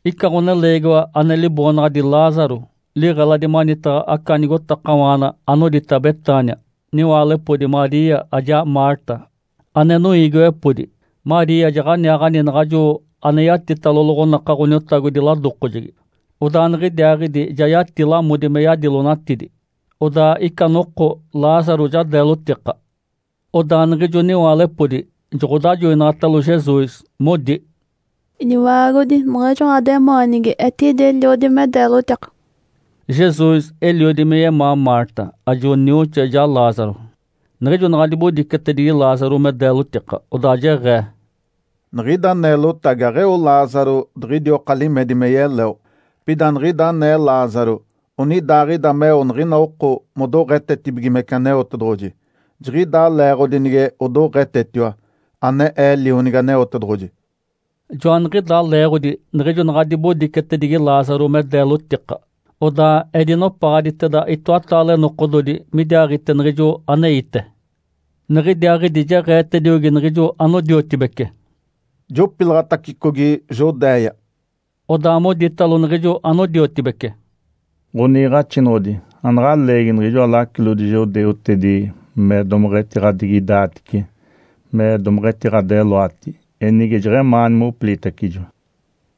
Ica ɡ̶oneleegiwa ane liboonaɡ̶adi Lázaro liɡ̶eladi manitaɡ̶a aca nigotakawaana anodita Betânia. Niwaalepodi, Maria ajaa Marta ane noiigiwepodi. Maria jaɡ̶aniaaɡ̶ani naɡ̶ajo ane yatitalo loɡ̶onaka Ǥoniotagodi ladokojegi, odaa niɡ̶idiaaɡ̶idi, ja yati lamodi me yadilonatidi. Odaa ica noko Lázaro ja deelotika. Odaa niɡ̶ijo niwaalepodi joɡ̶odajoinaɡ̶atalo Jesus, modi, “Iniotagodi, niɡ̶ijo ɡ̶ademaanigi etidi eliodi me deelotika”. Jesus eliodi me yemaa Marta, ajo nioxoa, ijaa Lázaro. Niɡ̶ijo naɡ̶a dibodicetedigi Lázaro me deelotika, odaa jeɡ̶ee, “Niɡ̶ida neelotagi aɡ̶eo Lázaro diɡ̶idioka limedi me yeleo. Pida niɡ̶ida anee Lázaro onidaaɡ̶ida meo niɡ̶ina oko modoɡ̶etetibigimece Aneotedoɡ̶oji. Jiɡ̶idaa leeɡ̶odi nige odoɡ̶etetiwa, ane Ee Lionigi Aneotedoɡ̶oji”. Joaniɡ̶idaa leeɡ̶odi niɡ̶ijo naɡ̶a dibodicetedigi Lázaro me deelotika, odaa edinopaɡ̶aditeda itoataale nokododi midiaaɡ̶ite niɡ̶ijo aneite. Niɡ̶idiaaɡ̶idi jeɡ̶eetediogi niɡ̶ijo anodiotibece, “Jopilaɡ̶atacicogi Judéia”. Odaa moditalo niɡ̶ijo anodiotibece, “Ǥoniiɡ̶axinoɡ̶odi. Anaɡ̶a leegi niɡ̶ijoa lacilodi judeutedi me domeɡ̶etiɡ̶adigidaatice me domeɡ̶etiɡ̶adeloati. Enige jeɡ̶emaani mopilitacijo!”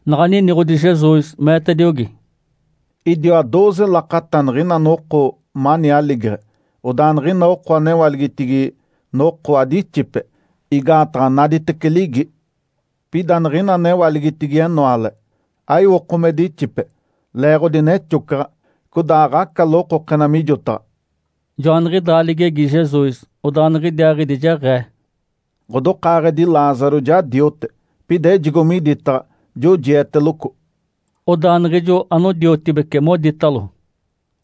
Naɡ̶a niniɡ̶odi Jesus, meetediogi, “Idiwa dooze lakata niɡ̶ina noko mani aligeɡ̶e. Odaa niɡ̶ina oko anewaligitigi noko adixipe, igaataɡ̶a naditece ligi. Pida niɡ̶ina anewaligitigi enoale, aiwoko me dixipe, leeɡ̶odi nexocaɡ̶a, codaa aɡ̶aca lokokena mijotaɡ̶a”. Joaniɡ̶idaa ligegi Jesus, odaa niɡ̶idiaaɡ̶idi jeɡ̶ee, “Ǥodokaaɡ̶edi Lázaro ja diote, pida ejigo miditaɡ̶a, jojieteloco”. Odaa niɡ̶ijo anodiotibece moditalo,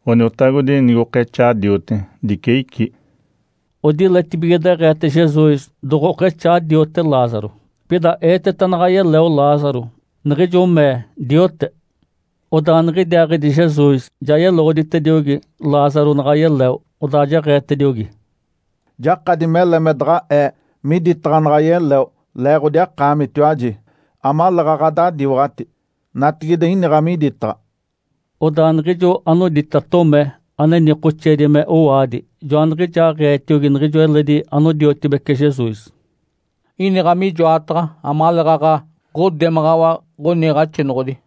“Ǥoniotagodi, nigokexaa diote, dice icí”. Odiletibige deɡ̶eete Jesus doɡ̶okexaa diote Lázaro. Pida eeteta naɡ̶a yeleo Lázaro, niɡ̶ijo mee diote. Odaa niɡ̶idiaaɡ̶idi Jesus ja yeloɡ̶oditediogi Lázaro naɡ̶a yeleo. Odaa jeɡ̶eetediogi, “Jakadi mele me daɡ̶a Ee miditaɡ̶a naɡ̶a yeleo leeɡ̶odi akaamitiwaji, amaleeɡ̶aɡ̶a adadiwaɡ̶ati. Natigide iniɡ̶a miditaɡ̶a”. Odaa niɡ̶ijo anodita Tomé, ane nikoxeedi me “Owaadi”, joaniɡ̶ijaaɡ̶eetiogi niɡ̶ijo eledi anodiotibece Jesus, “Iniɡ̶a mijoataɡ̶a amaleeɡ̶aɡ̶a ɡ̶odemaɡ̶awa Ǥoniiɡ̶axinoɡ̶odi”.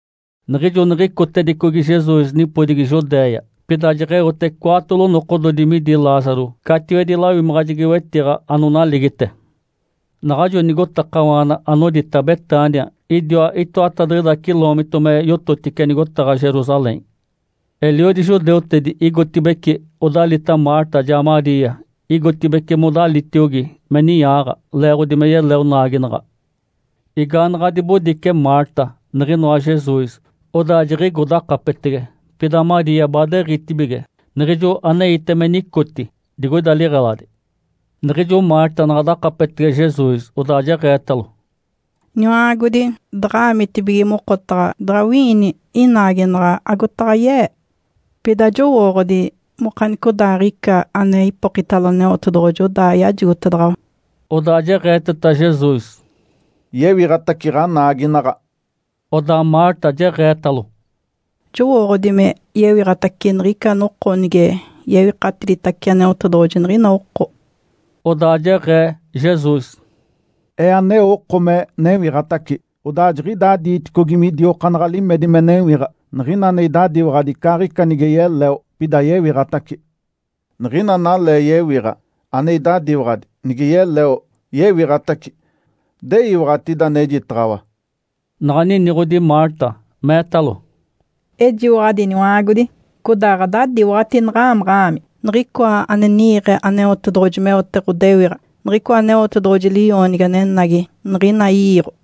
Niɡ̶ijo niɡ̶icotedicogi Jesus nipodigi Judéia, pida jeɡ̶eote cwaatolo nokododi midi Lázaro catiwedi lawimaɡ̶ajegi-wetiɡ̶a anonaligite. Naɡ̶ajo nigotakawaana anodita Betânia idiwa itoatadiɡ̶ida ciloomito me yototice nigotaɡ̶a Jerusalém. Eliodi judeutedi igotibeci odalita Marta, ajaa Maria, igotibeci modalitiogi me ninyaaɡ̶a, leeɡ̶odi me yeleo naaginaɡ̶a. Igaanaɡ̶a dibodice Marta niɡ̶inoa Jesus, odaa jiɡ̶igo dakapetege. Pida Maria baadeɡ̶itibige, niɡ̶ijo aneite me nicoti digoida liɡ̶eladi. Niɡ̶ijo Marta naɡ̶a dakapetege Jesus, odaa jeɡ̶eetalo, “Iniwa-aagodi. Daɡ̶a-aamitibige mokotaɡ̶a, daɡ̶anagawi-iini inaaginaɡ̶a agotaɡ̶a ye-ee. Pida jowooɡ̶odi mokanicodaaɡ̶ica ane ipokitalo Aneotedoɡ̶oji, odaa yajigotedaɡ̶awa”. Odaa jeɡ̶eeteta Jesus, “Yewiɡ̶atace ɡ̶anaagina”. Odaa Marta jeɡ̶eetalo, “Jowooɡ̶odi me yewiɡ̶atace niɡ̶ica noko nige yewikatiditace Aneotedoɡ̶oji niɡ̶ina oko”. Odaa jeɡ̶ee Jesus, “Ee aneo oko me newiɡ̶atace, odaa jiɡ̶idaa diiticogi, midiokaanaɡ̶a limedi me newiɡ̶a. Niɡ̶ina ane idadiwaɡ̶adi icaaɡ̶ica nige yeleo, pida yewiɡ̶atace. Niɡ̶ina analee yewiɡ̶a, ane idadiwaɡ̶adi, nige yeleo, yewiɡ̶atace. De iwaɡ̶ati ida anejitaɡ̶awa?” Naɡ̶a niniɡ̶odi Marta, meetalo, “Ejiwaɡ̶adi, Iniwa-aagodi. Codaa ɡ̶adadiwaɡ̶ati naɡ̶a-aamaɡ̶a-aami Niɡ̶icoa ane ni-iiɡ̶e Aneotedoɡ̶oji meote ɡ̶odewiɡ̶a, niɡ̶icoa Aneotedoɡ̶oji Li-oonigi anenagi niɡ̶ina i-iiɡ̶o”.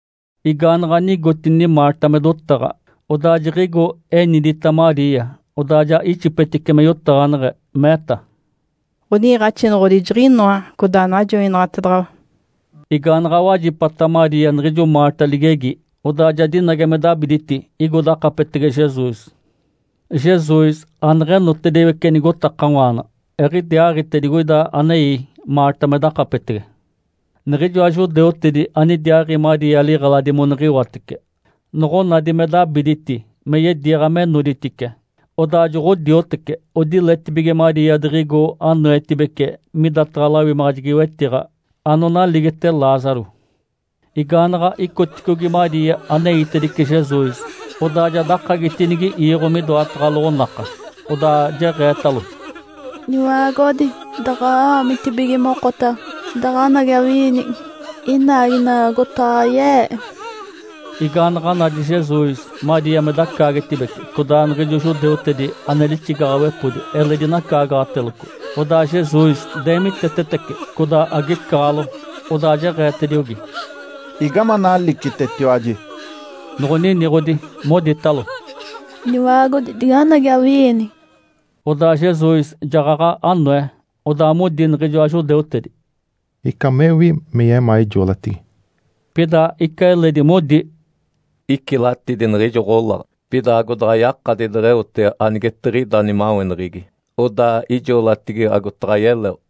Igaanaɡ̶a nigotini Marta me dotaɡ̶a, odaa jiɡ̶igo enidita Maria. Odaa ja ixipetice me yotaɡ̶aneɡ̶e meeta, “Ǥoni-iiɡ̶axinoɡ̶odi jiɡ̶inoa. Codaa najoinaɡ̶atedaɡ̶awa”. Igaanaɡ̶a wajipata Maria niɡ̶ijo Marta ligegi, odaa ja dinage me dabiditi, igo dakapetege Jesus. Jesus aneɡ̶enotediwece nigotakawaana, eɡ̶idiaaɡ̶ite digoida anei Marta me dakapetege. Niɡ̶ijoa judeutedi anidiaaɡ̶i Maria liɡ̶eladi moniɡ̶iwatece, noɡ̶onadi me dabiditi me yediiɡ̶a me noditice, odaa joɡ̶odioteci. Odiletibige Maria diɡ̶igo anoetibece midataɡ̶a lawimaɡ̶ajegi-wetiɡ̶a anonaligite Lázaro. Igaanaɡ̶a icoticogi Maria aneitedice Jesus, odaa ja dakagitinigi iiɡ̶o midoataɡ̶a loɡ̶onaka. Odaa jeɡ̶eetalo, “Iniwa-aagodi. Daɡ̶a-aamitibige mokotaɡ̶a, daɡ̶anagawi-iini inaaginaɡ̶a agotaɡ̶a ye-ee”. Igaanaɡ̶a nadi Jesus Maria me dacaagetibece, codaa niɡ̶ijo judeutedi ane lixigaɡ̶awepodi eledi nacaagaɡ̶ateloco, odaa Jesus deemitetetece, codaa agecaɡ̶alo. Odaa jeɡ̶eetediogi, “Igame analicitetiwaji?” Noɡ̶oniniɡ̶odi, moditalo, “Ǥoniotagodi. Diganagi, awini!” Odaa Jesus jaɡ̶aɡ̶a anoe. Odaa modi niɡ̶ijoa judeutedi, “Ica mewi me yemaa ijoolatigi!” Pida ica eledi modi, “Icilatidi niɡ̶ijo ɡ̶olaɡ̶a. Pida agodaɡ̶ayakadi deɡ̶eote anigetiɡ̶ida nimaweneɡ̶egi, odaa ijoolatigi agotaɡ̶a yeleo?”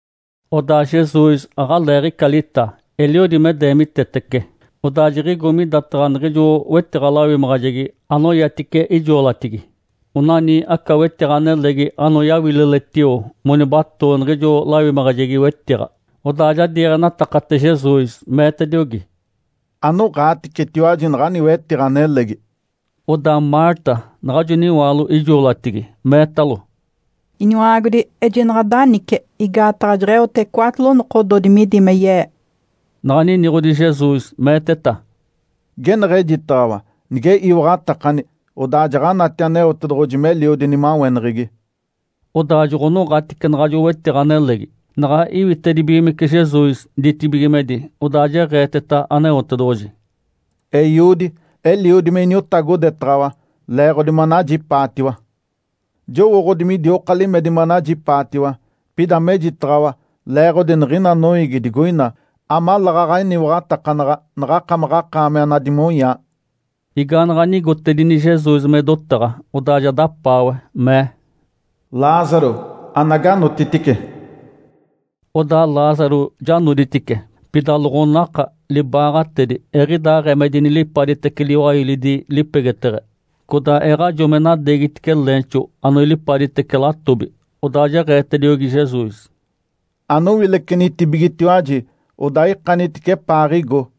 Odaa Jesus aɡ̶aleeɡ̶ica lita, eliodi me deemitetece. Odaa jiɡ̶igo midataɡ̶a niɡ̶ijo wetiɡ̶a-lawimaɡ̶ajegi anoyatice ijoolatigi. Onani aca wetiɡ̶a nelegi anoyawililetio monibatoo niɡ̶ijo lawimaɡ̶ajegi-wetiɡ̶a. Odaa ja diiɡ̶enatakate Jesus, meetediogi, “Anoɡ̶aaticetiwaji naɡ̶ani wetiɡ̶a nelegi”. Odaa Marta, naɡ̶ajo niwaalo ijoolatigi meetalo, “Iniwa-aagodi, ejinaɡ̶a danice. Igaataɡ̶a jeɡ̶eote cwaatolo nokododi midi me ye-ee”. Naɡ̶a niniɡ̶odi Jesus, meeteta, “Geneɡ̶ejitaɡ̶awa, nige iwaɡ̶atakani, odaa jaɡ̶anati Aneotedoɡ̶oji meliodi nimaweneɡ̶egi”. Odaa joɡ̶onoɡ̶atice naɡ̶ajo wetiɡ̶a nelegi. Naɡ̶a iwitedibigimece Jesus ditibigimedi, odaa jeɡ̶eeteta Aneotedoɡ̶oji, “Eiodi, eliodi me iniotagodetaɡ̶awa leeɡ̶odi manajipaatiwa. Jowooɡ̶odi midioka limedi manajipaatiwa. Pida mejitaɡ̶awa leeɡ̶odi niɡ̶ina noiigi digoina, amaleeɡ̶aɡ̶a eniwaɡ̶atakanaɡ̶a naɡ̶akamaɡ̶akaami anadimonyaa”. Igaanaɡ̶a nigotedini Jesus me dotaɡ̶a, odaa ja dapaawe, mee, “Lázaro, anagi, anotitice!” Odaa Lázaro ja noditice. Pida loɡ̶onaka, libaaɡ̶atedi eɡ̶idaaɡ̶ee me dinilipaditece liwailidi lipegeteɡ̶e, codaa eɡ̶ajo me nadeegitice leenxo anoilipaditece latobi. Odaa jeɡ̶eetediogi Jesus, “Anowilecenitibigetiwaji, odaa ikanitice epaaɡ̶igo”.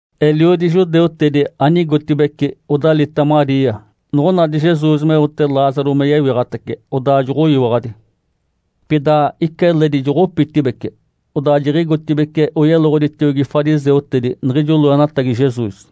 Eliodi judeutedi anigotibeci odalita Maria noɡ̶onadi Jesus meote Lázaro me yewiɡ̶atace, odaa joɡ̶oyiwaɡ̶adi. Pida ica eledi joɡ̶opitibeci, odaa jiɡ̶igotibeci oyeloɡ̶oditiogi fariseutedi niɡ̶ijo loenatagi Jesus.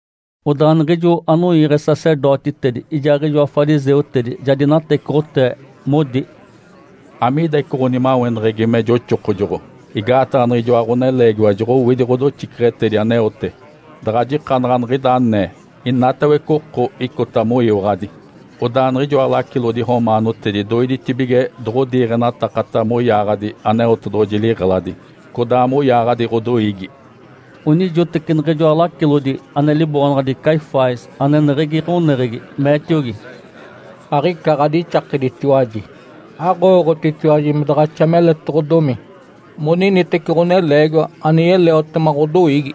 Odaa niɡ̶ijo anoiiɡ̶e sacerdotitedi ijaaɡ̶ijoa fariseutedi ja dinatecoɡ̶otee, modi, “Amiida ica ɡ̶onimaweneɡ̶egi me joxokojoɡ̶o? Igaataɡ̶a niɡ̶ijoa ɡ̶oneleegiwa joɡ̶owidi ɡ̶odoxiceɡ̶etedi aneote. Daɡ̶a jikanaɡ̶a niɡ̶ida anee, inatawece oko icota moyiwaɡ̶adi. Odaa niɡ̶ijoa lacilodi romaanotedi doidetibige doɡ̶odiiɡ̶enataka moyaaɡ̶adi Aneotedoɡ̶oji liɡ̶eladi, codaa moyaaɡ̶adi ɡ̶odoiigi”. Onijoteci niɡ̶ijoa lacilodi ane liboonaɡ̶adi Caifás ane eneɡ̶egi ɡ̶oneɡ̶egi, meetiogi, “Aɡ̶ica ɡ̶adixakeditiwaji! Aɡ̶owooɡ̶otitiwaji me daɡ̶axa meletoɡ̶odomi moniniteci ɡ̶oneleegiwa ane yeleotema ɡ̶odoiigi,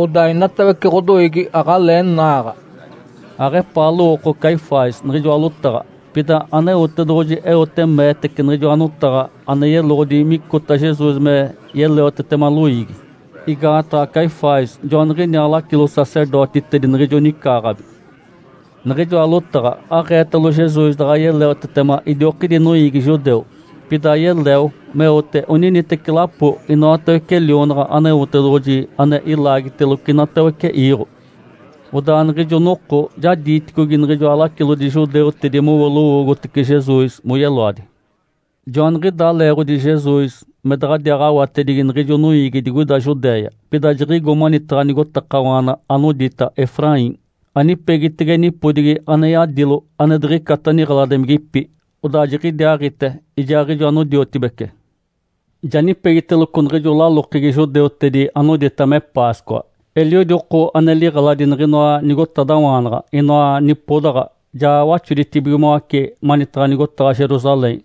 odaa inatawece ɡ̶odoiigi aɡ̶alee naaɡ̶a”. Aɡ̶epaa lowooko Caifás niɡ̶ijoa lotaɡ̶a. Pida Aneotedoɡ̶oji eote meetece niɡ̶ijoa notaɡ̶a ane yeloɡ̶odi micota Jesus me yeleotetema loiigi, igaataɡ̶a Caifás joaniɡ̶iniaa lacilo-sacerdotitedi niɡ̶ijo nicaaɡ̶abi. Niɡ̶ijoa lotaɡ̶a aɡ̶eetalo Jesus daɡ̶a yeleotetema idiokidi noiigi judeu, pida yeleo meote oniniteci lapo inoatawece lionaɡ̶a Aneotedoɡ̶oji ane ilaagiteloco inatawece iiɡ̶o. Odaa niɡ̶ijo noko ja diiticogi niɡ̶ijoa lacilodi judeutedi mowo lowoogotece Jesus moyeloadi. Joaniɡ̶idaa leeɡ̶odi Jesus me daɡ̶adiaaɡ̶awatedigi niɡ̶ijo noiigi digoida Judéia. Pida jiɡ̶igo manitaɡ̶a nigotakawaana anodita Efraim, anipegitege nipodigi ane yadilo ane diɡ̶icata niɡ̶eladimigipi. Odaa jiɡ̶idiaaɡ̶ite ijaaɡ̶ijo anodiotibece. Ja nipegiteloco niɡ̶ijo lalokegi judeutedi anodita me Páscoa. Eliodi oko ane liɡ̶eladi niɡ̶inoa nigotadawaanaɡ̶a, inoa nipodaɡ̶a, ja waxoditibigimoace manitaɡ̶a nigotaɡ̶a Jerusalém.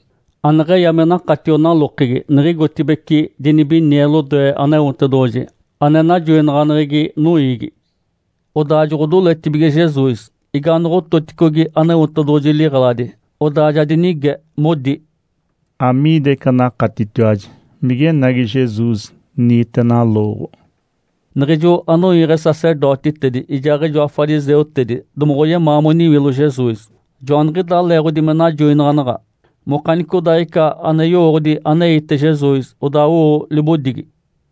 Aneɡ̶eya me nakatio nalokegi niɡ̶igotibeci dinibinie lodoe Aneotedoɡ̶oji, ane najoinaɡ̶aneɡ̶egi noiigi. Odaa joɡ̶odoletibige Jesus, igaanoɡ̶ototicogi Aneotedoɡ̶oji liɡ̶eladi, odaa ja dinige, modi, “Amiida ica anakatitiwaji? Migenagi Jesus niite nalooɡ̶o?” Niɡ̶ijo anoiiɡ̶e sacerdotitedi, ijaaɡ̶ijoa fariseutedi domoɡ̶oyemaa moniwilo Jesus. Joaniɡ̶idaa leeɡ̶odi me najoinaɡ̶anaɡ̶a mokanicodaaɡ̶ica ane yowooɡ̶odi aneite Jesus, odaa owo libodigi.